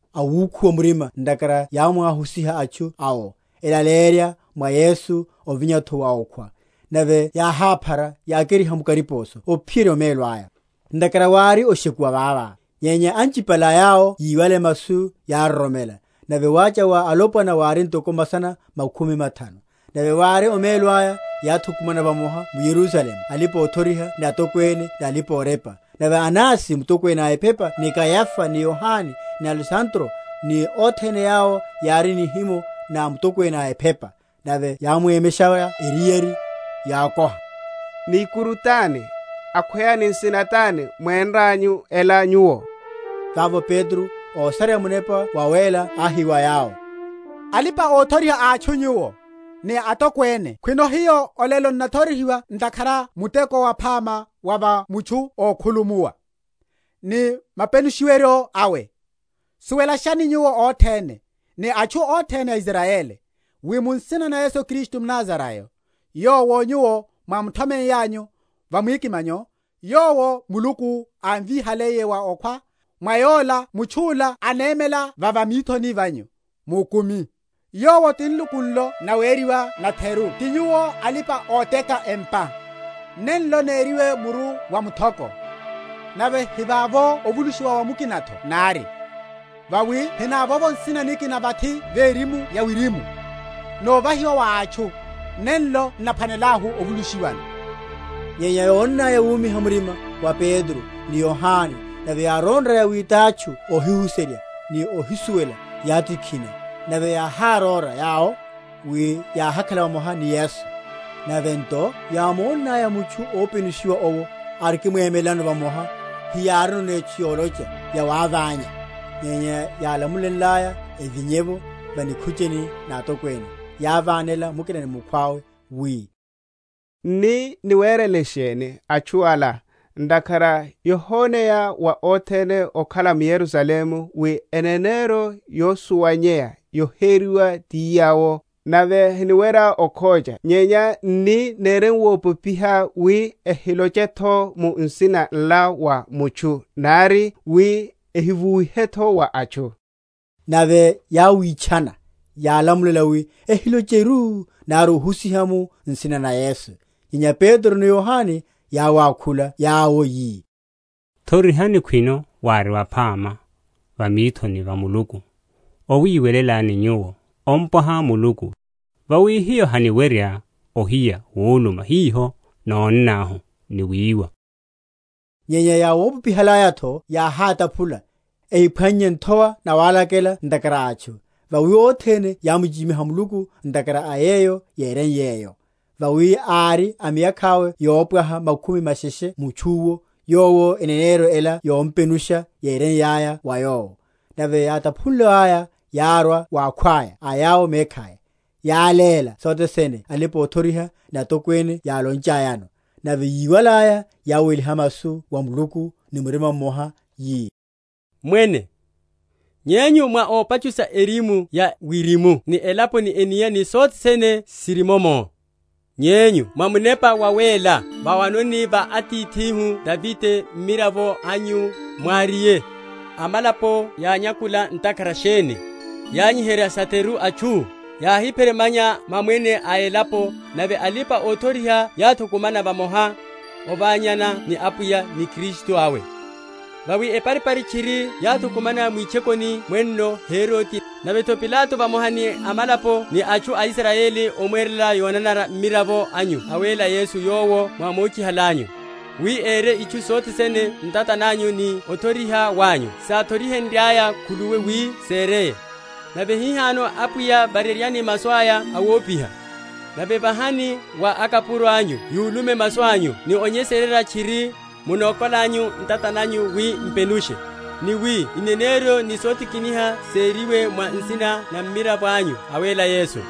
awúkhuwa murima ntakhara yámwáhusiha atchu awo, elaleyerya mwa Yesu ovinya’tho wa okhwa. Nave yáháphara, yákeriha mu kariposo ophiyerya omelo aya; ntakhara wári oshekuwa vava. Nyenya anchipale a yawo yíwale masu yároromela; nave wácha wa alopwana wári ntoko masana makhumi mathanu. Nave vári omelo aya, yáthukumana vamoha m’Yerusalemu alipa‐othoriha ni atokwene, ni alipa‐orepa; nave Anasi mutokwene a ephepa, ni Kayafa, ni Yohane, ni Alesandro, ni othene yawo yári a nihimo na mutokwene a ephepa. Nave yáwemenshaya eriyari, yákoha, Ni ikuru tani, akhweya ni nsina tani mwénranyu ela nyuwo? Vavo Petro, ósareya Munepa Wawéla áhi wa yawo, Alipa‐othoriha a atchu nyuwo, ni atokwene, khwino hiyo olelo n’nathorihiwa ntakhara a muteko waphama wa va mutchu ókhulumuwa, ni mapenusheryo awe, suwelashani nyuwo othene, ni atchu othene a Israyeli, wi mu nsina na Yesu Kristu mNazarayo, yowo nyuwo mwámuthomeiyanyu va mwikimanyo, yowo Muluku ámvíhaliye wa okhwa, mwa Yola mutchu’la anemela va va mithoni vanyu, mukumi. Yowo ti nluku nlo naweriwa natheru ti nyuwo alipa‐oteka empa, nenlo nériwe muru wa muthoko. Nave hivavo ovulusha mwa mukina’tho nari, vawi hinavovo nsina nikina vathi verimu ya wirimu, novahiwa wa atchu, nenlo n’naphwanelahu ovulushiwano. Nyenya yónnaya wumiha‐murima wa Petro ni Yohane, nave yáronraya wi tatchu óhihuserya ni óhísuwela, yátikhina, nave yáharóra yawo, wi yáhakhala vamoha ni Yesu. Nave nto yámónaya mutchu ópenushiwa owo arikimwemelano vamoha, hiyárino etchu yolocha yawáványa. Nyenya yálamulenlaya evinye’vo va nikhucheni na atokwene, yávánelana mukina ni mukhwawe, wi, N’ni niwerele sheni atchu ala? ntakhara yohoneyaru wa othene ókhala m’Yerusalemu wi eneneryo yosuwanyeya yoheriwa ti yawo, nave haniwerya okhocha. Nyenya n’ni neremuwopopiha wi ehiloche’tho mu nsina nla wa mutchu nari, wi ehivuwe’tho wa atchu. Nave yáwítchana, yálamulela wi ehilocheru nari ohusiha mu nsina na Yesu. Nyenya Petro ni Yohane yáwákhula yawo yi, Thorihani, khwino wári waphama va mithoni va Muluku owiwelelani nyuwo ompwaha Muluku; vawi hiyo haniwerya ohiya wuluma hiho nónnahu ni wiwa. Nyenya yáwopopihalaya’tho yáhátaphula, ehiphwannye nthowa nawálakela ntakhara a atchu; Vawi othene yámuchichimiha Muluku ntakhara a yeyo yéreiye’yo. Vawi ári a miyakha’we yopwaha makhumi masheshe mutchu’wo, yowo eneneryo ela yompenusha yéreiyaya wa yowo. Nave yátaphuliwaya, yárwa wa akhwaya a yawo mekhaya, yáléla sothe sene alipa‐othoriha ni atokwene yálonchayano. Nave yíwalaya, yáweliha masu wa Muluku ni murima mmoha, yi, Mwene, Nyenyu mwá ópachusha erimu ya wirimu ni elapo, ni enia, ni sothe sene siri mummo: Nyenyu mwa Munepa Wawéla, vawanoni va atithihu Davide mmiravo anyu, mwáriye, Amalapo yányakula ntakhara sheni? Yányiherya satheru atchu? Yáhípheremanya mamwene a elapo, Nave alipa‐othoriha yáthukumana vamoha, Oványana ni Apwiya, ni Kristu awe. Vawi eparipari tchiri yáthukumana mwitchokoni mwenno Herode, nave’tho Pilato vamoha ni amalapo ni atchu a Israyeli omwerela yonanara mmiravo anyu awéla Yesu yowo mwámochihalanyu; wi ere itchu sothe sene ntata nanyu ni othoriha wanyu sáthori?-?henryaya khuluwi wi sereye. Nave hihano Apwiya, vareryani masu aya awopiha, nave vahani wa akapuro anyu yúlume masu anyu ni onyesererya tchiri, munokolanyu ntata nanyu wi m’penushe: ni wi ineneryo ni sotikiniha seriwe mwa nsina na Mmiravo anyu awéla Yesu.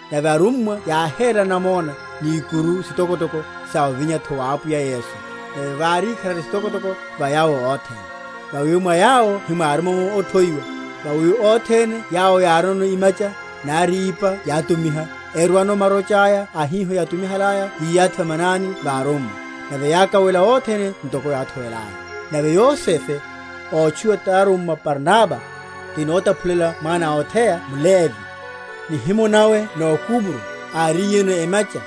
Nave arummwa yáhérela namona ni ikuru sitokotoko sa ovinya’tho wa Apwiya Yesu: nave vári ikharari sitokotoko va yawo othene. Vawi mwa yawo hemwárimomo óthowiwa: vawi othene yawo yárino imacha, nari ipa yátumiha, erwano marocha aya a hiho yátumihalaya, yiyathi va manani va arummwa: nave yákawela othene ntoko yáthowelaya. Nave Yosefe, ótchuwiwa tarummwa Barnaba, (ti notaphuleya mwana a otheya) mLevi, nihimo nawe nó Kupro, áriyeno emacha,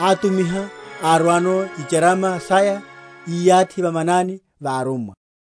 átumiha, arwano icharama saya, iyathi va manani va arummwa.